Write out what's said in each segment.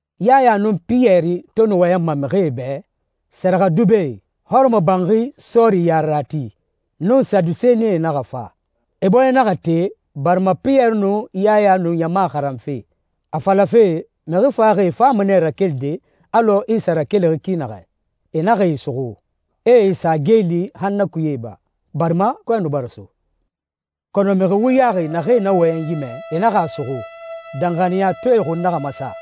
Yaya nun Piyɛri to nu wɔyɛnma mixie bɛ, sɛrɛxɛdubɛe, hɔrɔmɔbanxi sɔɔri yarerati, nun Sadusenie naxa fa. E bɔɲɛ naxa te barima Piyɛri nun Yaya nu ɲama xaranfe, a falafe mixi faxaxie fama nɛ rakelide alɔ Isa rakelixi ki naxɛ. E naxa e suxu, e e sa geeli han na kuye iba, barima kɔɛ nu bara so. Kɔnɔ mixi wuyaxi naxee na wɔyɛnyi mɛ, e naxa a suxu. Danxaniyatɔɛe xun naxa masa,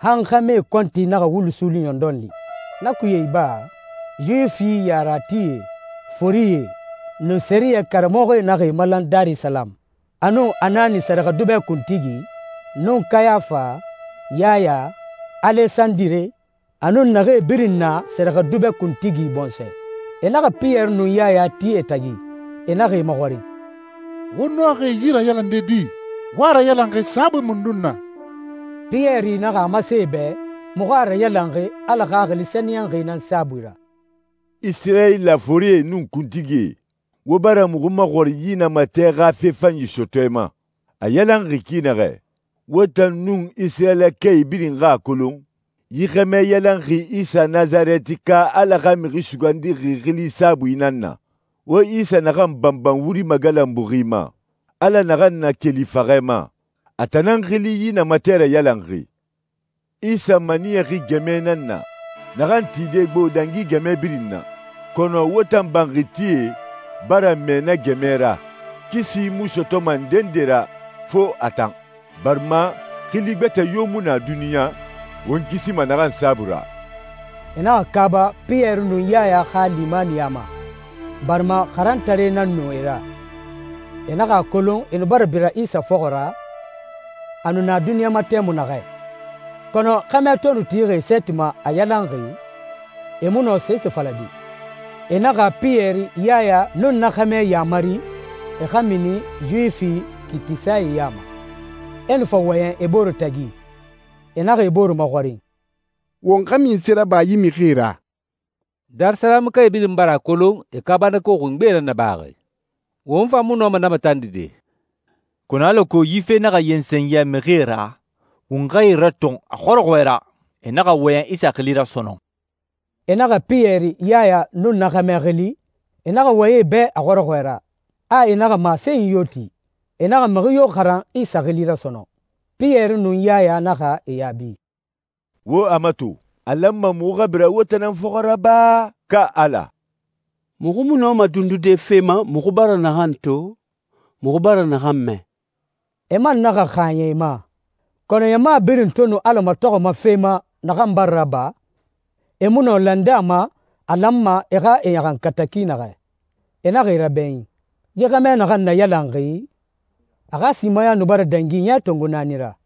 han xɛmɛe kɔnti naxa wulu suuli ɲɔndɔn li. Na kuye iba, Yuwifi yareratie, forie, nun sɛriyɛ karamɔxɔe naxa e malan Darisalamu, a nun Anani sɛrɛxɛdubɛ kuntigi, nun Kayafa, Yaya, Alesandire, a nun naxee birin na sɛrɛxɛdubɛ kuntigi bɔnsɔɛ. E naxa Piyɛri nun Yaya ti e tagi, e naxa e maxɔrin, «Wo nɔxi yi rayalande di? Wo a rayalanxi saabui mundun na?» Piyɛri naxa a masen e bɛ muxu a rayalanxi Ala Xaxili Sɛniyɛnxi nan saabui ra, «Isirayila forie nun kuntigie, wo bara muxu maxɔrin yi namatɛ xa fe fanyi sɔtɔɛ ma, a yalanxi ki naxɛ. Wo tan nun Isirayilakae birin xa a kolon yi xɛmɛ yalanxi Isa Nasarɛtika, Ala xa Mixi Sugandixi, xili saabui nan na. Wo Isa naxan banban wuri magalanbuxi ma, Ala naxan nakeli faxɛ ma, a tan nan xili yi namatɛ rayalanxi. Isa maniyaxi ‹gɛmɛ nan na naxan tide gbo dangi gɛmɛ birin na, kɔnɔ wo tan banxitie bara mɛɛ na gɛmɛ ra.› Kisi mu sɔtɔma ndende ra fo a tan, barima xili gbɛtɛ yo mu na duniɲa, won kisima naxan saabui ra.» E naxa kaaba Piyɛri nun Yaya xa limaniya ma, barima xarantaree nan nu e ra. E naxa a kolon e nu bara bira Isa fɔxɔ ra a nu na duniɲa ma tɛmui naxɛ. Kɔnɔ xɛmɛ to nu tixi e sɛɛti ma, a yalanxi, e mu nɔ sese falade. E naxa Piyɛri, Yaya, nun na xɛmɛ yaamari e xa mini Yuwifi kiitisae ya ma. E nu fa wɔyɛn e bore tagi. E naxa e bore maxɔrin, «Won xa munse raba yi mixie ra? Darisalamukae birin bara a kolon e kaabanako xungbe nan nabaxi. Won fan mu nɔma na matandide. Kɔnɔ alako yi fe naxa yensen yɛ mixie ra, won xa e ratɔn a xɔrɔxɔɛ ra, e naxa wɔyɛn Isa xili ra sɔnɔn.» E naxa Piyɛri, Yaya, nun na xɛmɛ xili. E naxa wɔyɛn e bɛ a xɔrɔxɔɛ ra, a e naxa masenyi yo ti, e naxa mixi yo xaran Isa xili ra sɔnɔn. Piyɛri nun Yaya naxa e yaabi, «Wo a mato, a lanma muxu xa bira wo tan nan fɔxɔ ra ba, ka Ala? Muxu mu nɔma dundude fe ma muxu bara naxan to, muxu bara naxan mɛ.» E man naxa xaaɲɛ e ma, kɔnɔ ɲama birin to nu Ala matɔxɔma fe ma naxan bara raba, e mu nɔ lande a ma a lanma e xa e ɲaxankata ki naxɛ. E naxa e rabɛɲin. Yi xɛmɛ naxan nayalanxi, a xa simaya nu bara dangi ɲɛ tongo naani ra.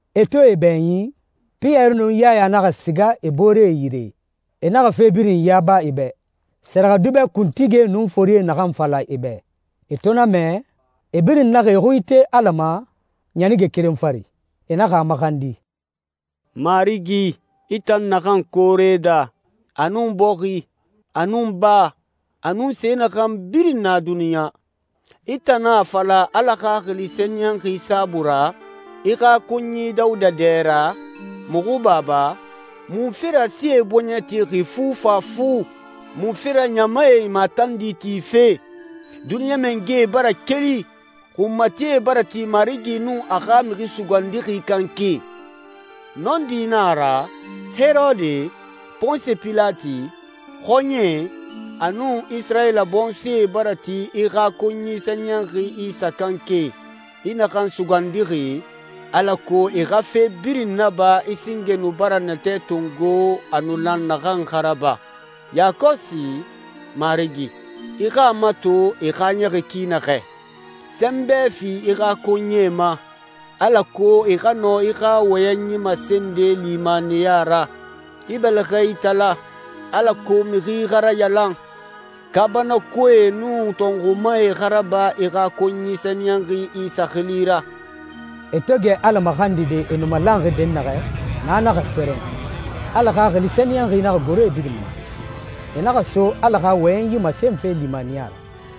E to e bɛɲin, Piyɛri nun Yaya naxa siga e booree yire. E naxa fe birin yaba e bɛ sɛrɛxɛdubɛ kuntigie nun forie naxan fala e bɛ. E to na mɛ, e birin naxa e xui ite Ala ma ɲanige keren fari. E naxa a maxandi, «Marigi, i tan naxan koore daa, a nun bɔxi, a nun baa, a nun se naxan birin na duniɲa, i tan nan a fala Ala Xaxili Sɛniyɛnxi saabui ra, i xa konyi Dawuda dɛ ra, muxu baba, ‹Munfe ra sie bɔɲɛ texi fufafu? Munfe ra ɲamae matandi tife? Duniɲa mangɛe bara keli, xunmatie bara ti Marigi nun a xa Mixi Sugandixi kanke.›» «Nɔndi na a ra, Herode, Ponsi Pilati, xɔɲɛe, a nun Isirayila bɔnsɔɛe bara ti i xa konyi sɛniyɛnxi Isa kanke, i naxan sugandixi, alako e xa fe birin naba i singe nu bara natɛ tongo a nu lan naxan xa raba. Yakɔsi, Marigi, i xa a mato e xaaɲɛxi ki naxɛ. Sɛnbɛ fi i xa konyie ma, alako e xa nɔ i xa wɔyɛnyi masende limaniya ra. I bɛlɛxɛ itala, alako mixi xa rayalan, kaabanakoee nun tɔnxumae xa raba i xa konyi sɛniyɛnxi Isa xili ra.» E to gɛ Ala maxandide, e nu malanxi dɛnnaxɛ, na naxa sɛrɛn. Ala Xaxili Sɛniyɛnxi naxa goro e birin ma. E naxa so Ala xa wɔyɛnyi masenfe limaniya ra.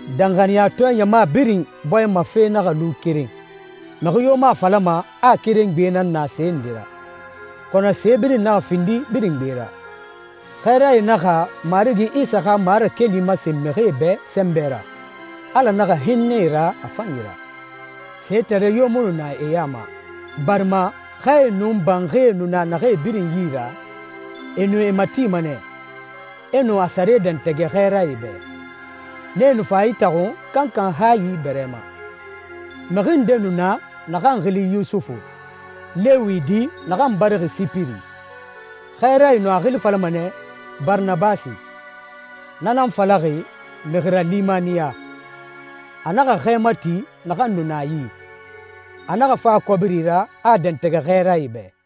Danxaniyatɔɛ ɲama birin bɔɲɛ ma fe naxa lu keren. Mixi yo mu a falama a keren gbe nan na se nde ra, kɔnɔ se birin naxa findi birin gbe ra. Xɛɛrae naxa Marigi Isa xa marakeli masen mixie bɛ sɛnbɛ ra. Ala naxa hinnɛ e ra a fanyi ra. Setare yo mu nu na e ya ma, barima xɛe nun banxie nu na naxee birin yi ra, e nu e matima nɛ, e nu a sare dɛntɛgɛ xɛɛrae bɛ. Nee nu fa a itaxun kankan hayi bɛrɛ ma. Mixi nde nu na naxan xili Yusufu, Lewi di naxan barixi Sipiri. Xɛɛrae nu a xili falama nɛ Baranabasi, na nan falaxi «mixi ralimaniya». A naxa xɛ mati naxan nu na a yi, a naxa fa a kɔbiri ra, a a dɛntɛgɛ xɛɛrae bɛ.